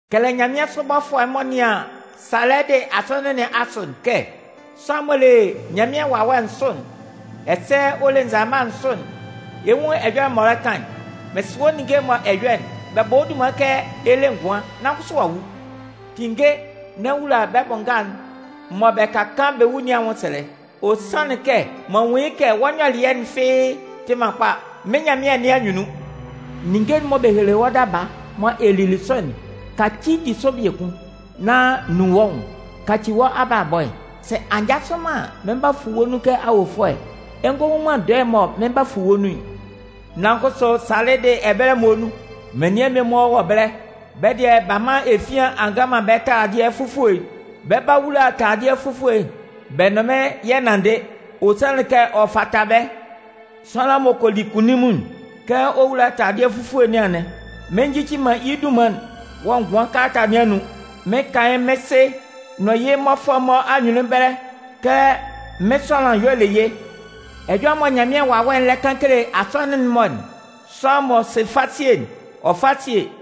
Kɛlɛ nyanmɩansʋ bɔfʋɛ'n m'ɔ nɩan Salɩdɩ Asɔnɩn nɩn asʋ'n kɛ: Sʋanlan'n m'ɔ le Nyanmɩan Wawɛ nsʋ'n, ɛsɛ ɔ le nzalama nsʋ'n, ɛ 'nwun ɛjɔlɛ mɔ ɔ lɛ kan'n: Mɩn sɩ wɔ́ ninnge'n mɔ ɛ yɔ'n. Bɛ bɔ wɔ́ dunman kɛ ɛ le ngʋan, nan kʋsʋ a wu. Tinnge nán wula bɛ́ bʋ nga'n mɔ bɛ ka kaan bɛ́ wu nɩn anwʋnsɛlɛ. Ɔ sanlɩn kɛ m'an nwun yɩ́ kɛ wɔ́ nyɔlɩɛ'n fɩ́ɩ́ tɩ man kpa mɩ́n Nyanmɩan nɩn anyunnun. Ninnge'n mɔ bɛ helelɩ wɔ́ daba mɔ ɛ lili sʋ'n, kacɩ bɛ́ di sʋ biekun, nán nun wɔ́ nwʋn kaci wɔ́ abalabɔ'n. Sɛ a njasʋ man an, mɩn 'ba fu wɔ́ nun kɛ awofʋɛ, ɛ ngɔ nwun man dɔɛ mɔ mɩn 'ba mɩn fu wɔ́ nun'n. Nan kʋsʋ Salɩdɩ ɛbɛlɛ muonun, menian mmie-mɔ wɔ ɛbɛlɛ, bɛ́ dɩɛ, b'a man efian a ngan man bɛ́ taladɩɛ fufue'n. Bɛ 'ba wula taladɩɛ fufue bɛ nʋn mɩ́n yɛ nanndɩ, ɔ sanlan kɛ ɔ sɛ fata bɛ́. Sʋanlan m'ɔ kɔ li kunnunmun'n, kɛ ɔ 'wula taladɩɛ fufue nɩn anɩn. Mɩn njici man yɩ́ dunman'n wɔ ngʋan kalata nɩn anun. Mɩn 'kan yɩ́ mɩ́n Sɩ nʋn yɩ́ mmɔfʋɛ'n-mɔ anyunnun ɛbɛlɛ kɛ mɩ́n sʋanlan y'ɔ le yɩ́. Ɛjɔlɛ mɔ Nyanmɩan Wawɛ'n lɛ kan kele Asɔnɩn'n-mɔ'n, sʋanlan m'ɔ sɩ fasie'n, ɔ fá síe!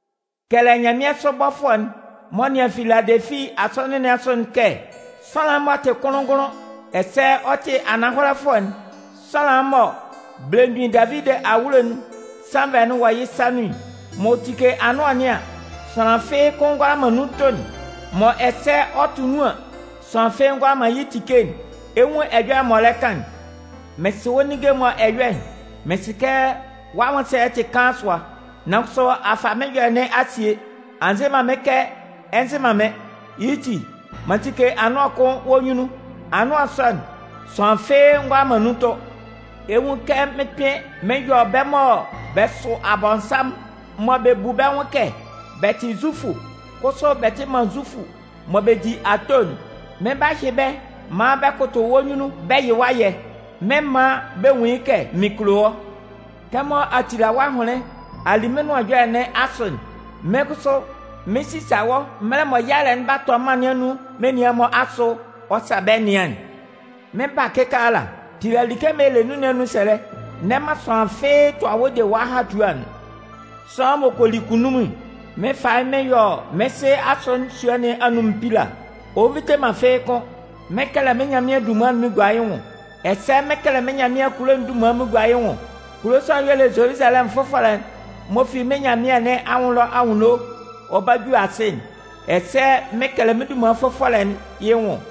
Kɛlɛ nyanmɩansʋ bɔfʋɛ'n m'ɔ nɩan Filadɛlɩfi Asɔnɩn nɩn asʋ'n kɛ: Sʋanlan'n m'ɔ tɩ kʋnlʋn-ngʋnlʋn, ɛsɛ ɔ tɩ Ananhɔlɛfʋɛ'n, sʋanlan'n mɔ belemgbin Davidi awulo'n sannvɛ'n wɔ yɩ́ sa nun'n, m'ɔ tike anʋan nɩn an, sʋanlan fɩ́ɩ́ kʋ́n ngʋala man nun tʋ'n, mɔ ɛsɛ ɔ tʋ nun an, sʋanlan fɩ́ɩ́ ngʋala man yɩ́ tike'n, ɛ 'nwun ɛjɔlɛ m'ɔ lɛ kan'n: Mɩn sɩ wɔ́ ninnge'n mɔ ɛ yɔ'n. Mɩn sɩ kɛ wɔ́ anwʋnsɛlɛ'n tɩ kaan sʋa, nan kʋsʋ a fa mɩ́n ɛjɔlɛ nɩn a sie. A nze man mɩ́n kɛ ɛ nzɩ man mɩ́n. Yɩ́ ti, m'an tike anʋan kʋn wɔ́ nyunnun. Anʋan sɔ'n, sʋanlan fɩ́ɩ́ ngʋala man nun tʋ. Ɛ 'nwun kɛ mɩn 'kpɩn mɩn yɔ bɛ́ mɔ bɛ sʋ Abɔnsanmʋn, mɔ bɛ bu bɛ́ nwʋn kɛ bɛ tɩ Zufʋ kʋsʋ bɛ tɩ man Zufʋ mɔ bɛ di ato'n. Mɩn 'ba hyɩ bɛ́ maan bɛ kʋtʋ wɔ́ nyunnun bɛ yɩ wɔ́ ayɛ. Mɩn 'man bɛ nwun yɩ́ kɛ mɩn kulo wɔ́. Kɛmɔ a tila wɔ́ ahʋnlɩn a li mɩ́n Nʋan Ɛjɔlɛ nɩn asʋ'n, mɩ́n kʋsʋ, mɩn 'sisa wɔ́ mɛlɛ mɔ yalɛ'n 'ba tɔ mân nɩn anun menian'n-mɔ asʋ ɔ sa bɛ́ nɩan'n. Mɩn 'ba kɩkaala. Tila like'n mɔ ɛ le nɩn anun sɛlɛ, n'ɛ man sʋanlan fɩ́ɩ́ tʋa wɔ́ de wɔ́ ahatua'n. Sʋanlan m'ɔ kɔ li kunnunmun'n, mɩn 'fa yɩ́ mɩn yɔ mɩ́n Sɩ asɔnɩn sua nɩn anun mpila, ɔ nvite man fɩ́ɩ́ kʋ́n. Mɩn 'kɛlɛ mɩ́n Nyanmɩan'n dunman'n mɩn gua yɩ́ nwʋn, ɛsɛ mɩn 'kɛlɛ mɩ́n Nyanmɩan'n kulo'n dunman mɩn gua yɩ́ nwʋn. Kulo sɔ'n, y'ɔ le Zoluzalɛmʋn fʋfɔlɛ'n m'ɔ fi mɩ́n Nyanmɩan nɩn anwʋn ɛlɔ anwunno ɔ 'ba ju asɩ'n. Ɛsɛ mɩn 'kɛlɛ mɩ́n dunman fʋfɔlɛ'n yɩ́ nwʋn.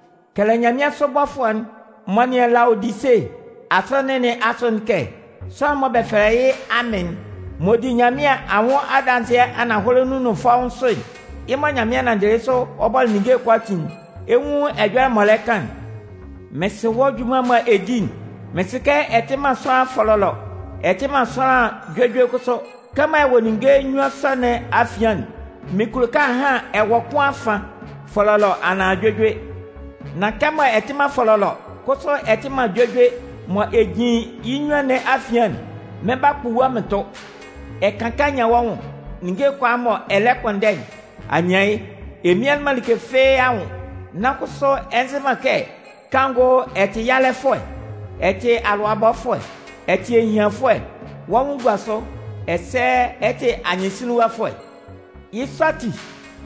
Kɛlɛ nyanmɩansʋ bɔfʋɛ'n m'ɔ nɩan Laodise Asɔnɩn nɩn asʋ'n kɛ: Sʋanlan'n mɔ bɛ fɛlɛ yɩ́ Amɩn'n, m'ɔ di Nyanmɩan anwʋn adanzɩɛ ananhɔlɛ nun nʋn fɔ́ʋ́n sʋ'n, yɩ́ mɔ Nyanmɩan nanndɩlɩ yɩ́ sʋ ɔ bɔlɩ ninnge'n-mɔ kʋalaatin'n, ɛ 'nwun ɛjɔlɛ m'ɔ lɛ kan'n: Mɩn sɩ wɔ́ junman'n mɔ ɛ di'n. Mɩn sɩ kɛ ɛ tɩ man sʋanlan fɔlɔlɔ, ɛ tɩ man sʋanlan juejue kʋsʋ. Kɛmɔ ɛ wɔ ninnge nnyuan sɔ nɩn afian'n, mɩn kulo kɛ ahan ɛ wɔ kʋn afan. Fɔlɔlɔ anaan juejue. Nan kɛmɔ ɛ tɩ man fɔlɔlɔ kʋsʋ ɛ tɩ man juejue mɔ ɛ jin yɩ́ nnyuan nɩn afian'n, mɩn 'ba kpu wɔ́ mɩn tʋ. Ɛ kan kɛ a nyan wɔ́ nwʋn. Ninnge'n kʋalaa mɔ ɛ lɛ kpʋnndɛ'n, a nyan yɩ́. Ɛ mmian man like fɩ́ɩ́ anwʋn. Nan kʋsʋ ɛ nzɩ man kɛ kanngʋ ɛ tɩ yalɛfʋɛ, ɛ tɩ alʋabɔfʋɛ. Ɛ tɩ ehianfʋɛ, wɔ́ nwʋn gua sʋ, ɛsɛ ɛ tɩ anyɩnsinlinwafʋɛ. Yɩ́ sɔ ati,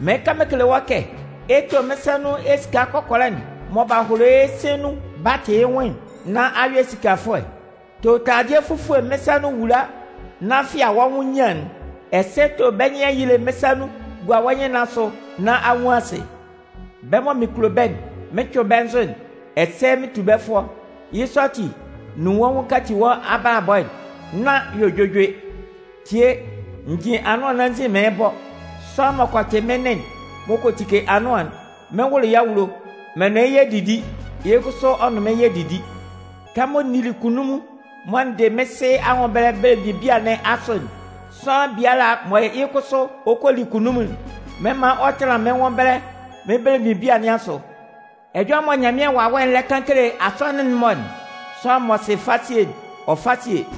mɩn 'kan mɩn kele wɔ́ kɛ ɛ tó mɩ́n sa nun esika kɔkɔlɛ'n mɔ b'a holo yɩ́ sɩ̂n nun b'a tɩ yɩ́ nwʋn'n nán a yɔ esikafʋɛ. To taladɩɛ fufue mɩ́n sa nun wula nán fɩa wɔ́ nwʋn nyian'n. Ɛsɛ to bɛ́ nyɩn ayile mɩ́n sa nun gua wɔ́ nyɩn nɩn asʋ nán a nwun asɩ. Bɛ́ mɔ mɩn kulo bɛ́'n, mɩn cʋɩn bɛ́ nzʋ'n ɛsɛ mɩn tu bɛ́ fʋɔ. Yɩ́ sɔ ati, nun wɔ́ nwʋn kaci wɔ́ abalabɔ'n nán yɔ juejue. Tie, n jin anʋan nɩn anzin mɩɩn bɔ. Sʋanlan m'ɔ kɔ tɩ mɩ́n nɩn'n m'ɔ kɔ tike anʋan'n, mɩn 'wʋlʋ yɩ́ awulo, mɩn nʋn yɩ́ yɛ 'didi, yɩ́ kʋsʋ ɔ nʋn mɩn yɛ 'didi. Kɛmɔ n nili kunnunmun mɔ n dɩ mɩ́n Sɩ anwʋn ɛbɛlɛ belemgbin bia nɩn asʋ'n, sʋanlan biala mɔ yɩ́ kʋsʋ ɔ kɔ li kunnunmun'n, mɩn 'man ɔ tanlan mɩ́n nwʋn ɛbɛlɛ mɩ́n belemgbin bia nɩn asʋ. Ɛjɔlɛ mɔ Nyanmɩan Wawɛ'n lɛ kan kele Asɔnɩn'n-mɔ'n, sʋanlan m'ɔ sɩ fasie'n, ɔ fá síe!